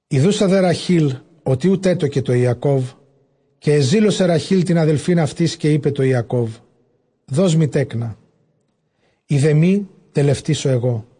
Ἰδοῦσα δὲ Ῥαχὴλ, ὅτι οὐ τέτοκε τῷ Ἱακώβ· καὶ ἐζήλωσε Ῥαχὴλ τὴν ἀδελφὴν αὐτῆς· καὶ εἶπε τῷ Ἰακὼβ, δός μοι τέκνα· εἰ δὲ μὴ, τελευτήσω ἐγώ.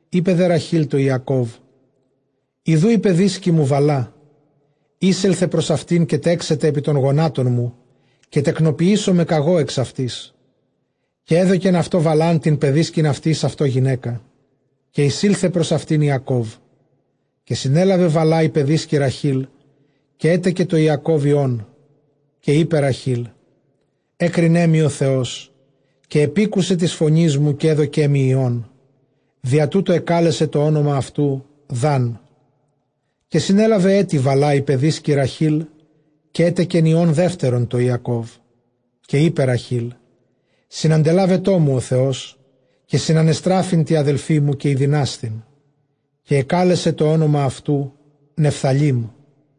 Εἶπε δὲ Ῥαχὴλ τῷ Ἰακὼβ, ἰδοὺ ἡ παιδίσκη μου Βαλλά· εἴσελθε πρὸς αὐτήν· καὶ τέξεται ἐπὶ τῶν γονάτων μου, καὶ τεκνοποιήσομαι κᾀγὼ ἐξ αὐτῆς. Καὶ ἔδωκεν αὐτῷ Βαλλὰν τὴν παιδίσκην αὐτῆς, αὐτῷ γυναῖκα· καὶ εἰσῆλθε πρὸς αὐτὴν Ἰακώβ. Καὶ συνέλαβε Βαλλὰ ἡ παιδίσκη Ῥαχὴλ, καὶ ἔτεκε τῷ Ἰακὼβ υἱόν. Καὶ εἶπε Ῥαχὴλ, ἔκρινέ μοι ὁ Θεὸς, καὶ ἐπήκουσε τῆς φωνῆς μου, καὶ ἔδωκε μοι υἱόν· διὰ τοῦτο ἐκάλεσε τὸ ὄνομα αὐτοῦ, Δάν. Καὶ συνέλαβεν ἔτι Βαλλὰ ἡ παιδίσκη Ῥαχὴλ, καὶ ἔτεκεν υἱὸν δεύτερον τῷ Ἰακώβ. Καὶ εἶπε Ῥαχὴλ, συναντελάβετό μου ὁ Θεὸς, καὶ συνανεστράφην τῇ ἀδελφῇ μου, καὶ ἠδυνάσθην· καὶ ἐκάλεσε τὸ ὄνομα αὐτοῦ, Νεφθαλεί.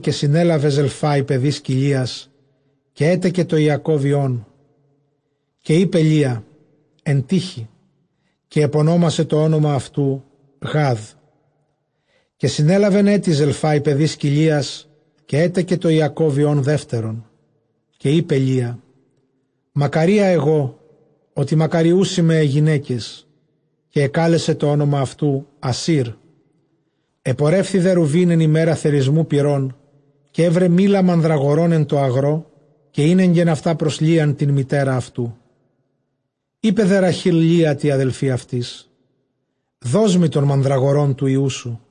Καὶ συνέλαβε Ζελφὰ ἡ παιδίσκη Λείας, καὶ ἔτεκε τῷ Ἰακὼβ υἱόν. Καὶ εἶπε Λεία, ἐν τύχῃ· καὶ ἐπωνόμασε τὸ ὄνομα αὐτοῦ, Γάδ. Καὶ συνέλαβεν ἔτι Ζελφὰ ἡ παιδίσκη Λείας, καὶ ἔτεκε τῷ Ἰακὼβ υἱὸν δεύτερον. Καὶ εἶπε Λεία, μακαρία ἐγὼ, ὅτι μακαριοῦσί με αἱ γυναῖκες· καὶ ἐκάλεσε τὸ ὄνομα αὐτοῦ, Ἀσήρ. Ἐπορεύθη δὲ Ῥουβὴν ἐν ἡμέρᾳ θερισμοῦ πυρῶν, καὶ εὗρε μῆλα μανδραγορῶν ἐν τῷ ἀγρῷ, καὶ ἤνεγκεν αὐτὰ πρὸς Λείαν τὴν μητέρα αὐτοῦ· εἶπε δὲ Ῥαχὴλ τῇ Λείᾳ τῇ ἀδελφῇ αὐτῆς, δός μοι τῶν μανδραγορῶν τοῦ υἱοῦ σου.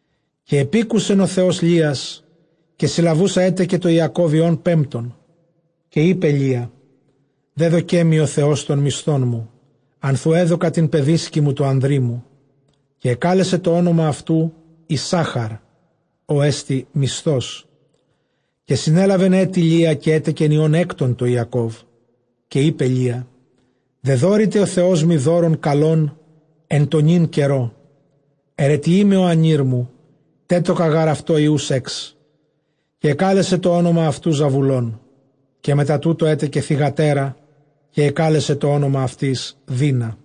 Καὶ ἐπήκουσεν ὁ Θεὸς Λείας· καὶ συλλαβοῦσα ἔτεκε τῷ Ἰακὼβ υἱὸν πέμπτον. Καὶ εἶπε Λεία, δέδωκέ μοι ὁ Θεὸς τὸν μισθόν μου, ἀνθʼ οὗ ἔδωκα τὴν παιδίσκην μου τῷ ἀνδρί μου· καὶ ἐκάλεσε τὸ ὄνομα αὐτοῦ, Ἰσσάχαρ, ὅ ἐστι μισθός. Καὶ συνέλαβεν ἔτι Λεία, καὶ ἔτεκεν υἱὸν ἕκτον τῷ Ἰακώβ. Καὶ εἶπε Λεία, δεδώρηται ὁ Θεός μοι δῶρον καλὸν ἐν τῷ νῦν καιρῷ· αἱρετιεῖ με ὁ ἀνήρ μου, τέτοκα γὰρ αὐτῷ υἱοὺς ἕξ· καὶ ἐκάλεσε τὸ ὄνομα αὐτοῦ, Ζαβουλών. Καὶ μετὰ τοῦτο ἔτεκε θυγατέρα, καὶ ἐκάλεσε τὸ ὄνομα αὐτῆς, Δεῖνα.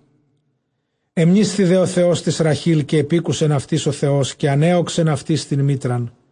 Ἐμνήσθη δὲ ὁ Θεὸς τῆς Ῥαχὴλ, καὶ ἔπήκουσεν αὐτῆς ὁ Θεός· καὶ ἀνέῳξεν αὐτῆς τὴν μήτραν.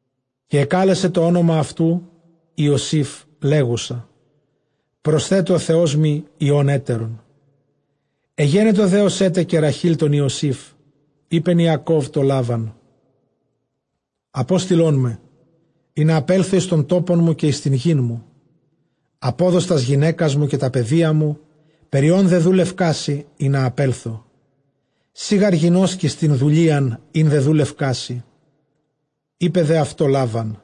Καὶ ἐκάλεσε τὸ ὄνομα αὐτοῦ Ἰωσὴφ, λέγουσα, προσθέτω ὁ Θεός μοι υἱὸν ἕτερον. Ἐγένετο δὲ ὡς ἔτεκε Ῥαχὴλ τὸν Ἰωσὴφ, εἶπεν Ἰακὼβ τῷ Λάβαν, ἀπόστειλόν με, ἵνα ἀπέλθω εἰς τὸν τόπον μου, καὶ εἰς τὴν γῆν μου. Ἀπόδος τὰς γυναῖκας μου, καὶ τὰ παιδία μου, περὶ ὧν δεδούλευκά σοι, ἵνα ἀπέλθω· σὺ γὰρ γινώσκεις τὴν δουλείαν, ἣν δεδούλευκά σοι. Εἶπε δὲ αὐτῷ Λάβαν,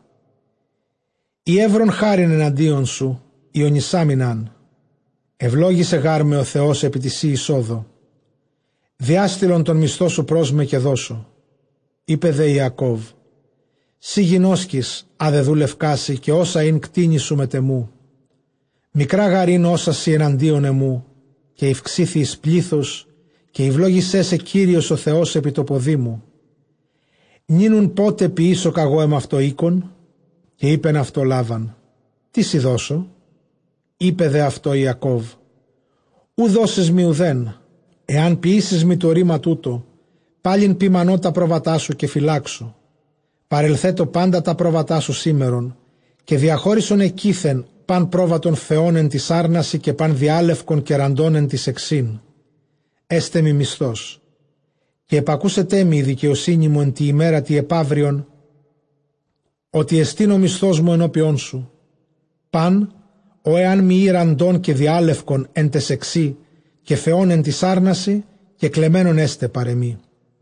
εἰ εὗρον χάριν ἐναντίον σου, οἰωνισάμην ἄν· εὐλόγησε γάρ με ὁ Θεὸς ἐπὶ τῇ σῇ εἰσόδῳ. Διάστειλον τὸν μισθόν σου πρός με, καὶ δώσω. Εἶπε δὲ Ἰακὼβ, σὺ γινώσκεις ἃ δεδούλευκά σοι, καὶ ὅσα ἦν κτήνη σου μετʼ ἐμοῦ. Μικρὰ γὰρ ἦν ὅσα σοι ἐναντίον ἐμοῦ, καὶ ηὐξήθη εἰς πλῆθος· καὶ εὐλόγησέ σε Κύριος ὁ Θεὸς ἐπὶ τῷ ποδί μου· νῦν οὖν πότε ποιήσω κᾀγὼ ἐμαυτῷ οἶκον; Καὶ εἶπεν αὐτῷ Λάβαν, τί σοι δώσω; Εἶπε δὲ αὐτῷ Ἰακὼβ, οὐ δώσεις μοι οὐθὲν, ἐὰν ποιήσῃς μοι τὸ ῥῆμα τοῦτο, πάλιν ποιμανῶ τὰ πρόβατά σου, καὶ φυλάξω. Παρελθέτω πάντα τὰ πρόβατά σου σήμερον, καὶ διαχώρισον ἐκεῖθεν πᾶν πρόβατον φαιὸν ἐν τοῖς ἄρνασι, καὶ πᾶν διάλευκον καὶ ῥαντὸν ἐν ταῖς αἰξὶν, ἔσται μοι μισθός. Καὶ ἐπακούσεταί μοι ἡ δικαιοσύνη μου ἐν τῇ ἡμέρᾳ τῇ ἐπαύριον, ὅτι ἐστὶν ὁ μισθός μου ἐνώπιόν σου· πᾶν ὃ ἐὰν μὴ ᾖ ῥαντὸν καὶ διάλευκον ἐν ταῖς αἰξὶ, καὶ φαιὸν ἐν τοῖς ἄρνασι, κεκλεμμένον ἔσται παρʼ ἐμοί.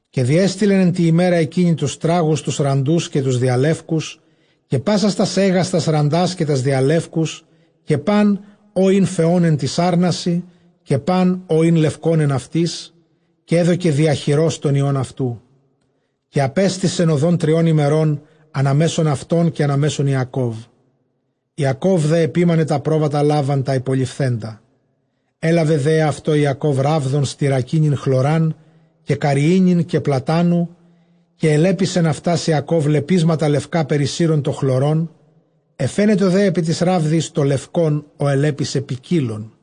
Καὶ διέστειλεν ἐν τῇ ἡμέρᾳ ἐκείνῃ τοὺς τράγους τοὺς ῥαντοὺς καὶ τοὺς διαλεύκους, καὶ πάσας τὰς αἶγας τὰς ῥαντὰς καὶ τὰς διαλεύκους, καὶ πᾶν ὃ ἦν φαιὸν ἐν τοῖς ἄρνασι, καὶ πᾶν ὃ ἦν λευκὸν ἐν αὐτοῖς, καὶ ἔδωκε διὰ χειρὸς τῶν υἱῶν αὐτοῦ. Καὶ ἀπέστησεν ὁδὸν τριῶν ἡμερῶν, καὶ ἀνὰ μέσον αὐτῶν καὶ ἀνὰ μέσον Ἰακώβ· Ἰακὼβ δὲ ἐποίμαινε τὰ πρόβατα Λάβαν τὰ ὑπολειφθέντα. Ἔλαβε δὲ ἑαυτῷ Ἰακὼβ ῥάβδον στυρακίνην χλωρὰν καὶ καρυΐνην καὶ πλατάνου· καὶ ἐλέπισεν αὐτὰς Ἰακὼβ λεπίσματα λευκά· καὶ περισύρων τὸ χλωρὸν, ἐφαίνετο ἐπὶ ταῖς ῥάβδοις τὸ λευκὸν, ὃ ἐλέπισε, ποικίλον.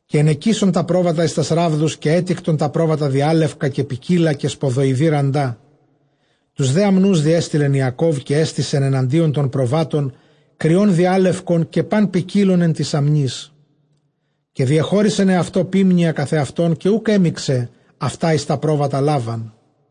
Καὶ ἐνεκίσσων τὰ πρόβατα εἰς τὰς ῥάβδους· καὶ ἔτικτον τὰ πρόβατα διάλευκα καὶ ποικίλα καὶ σποδοειδῆ ῥαντά. Τοὺς δὲ ἀμνοὺς διέστειλεν Ἰακὼβ, καὶ ἔστησεν ἐναντίον τῶν προβάτων κριὸν διάλευκον, καὶ πᾶν ποικίλον ἐν τοῖς ἀμνοῖς· καὶ διεχώρισεν ἑαυτῷ ποίμνια καθʼ ἑαυτὸν, καὶ οὐκ ἔμιξεν αὐτὰ εἰς τὰ πρόβατα Λάβαν.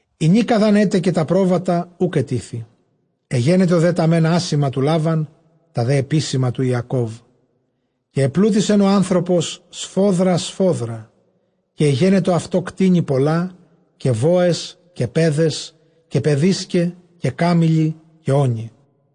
Ἡνίκα δʼ ἂν ἔτεκε τὰ πρόβατα, οὐκ ἐτίθει· ἐγένετο δὲ τὰ μὲν ἄσημα τοῦ Λάβαν, τὰ δὲ ἐπίσημα τοῦ Ἰακώβ. Καὶ ἐπλούτησεν ὁ ἄνθρωπος σφόδρα σφόδρα· καὶ ἐγένετο αὐτῷ κτήνη πολλὰ, καὶ βόες, καὶ παῖδες, καὶ παιδίσκαι, καὶ κάμηλοι, καὶ ὄνοι.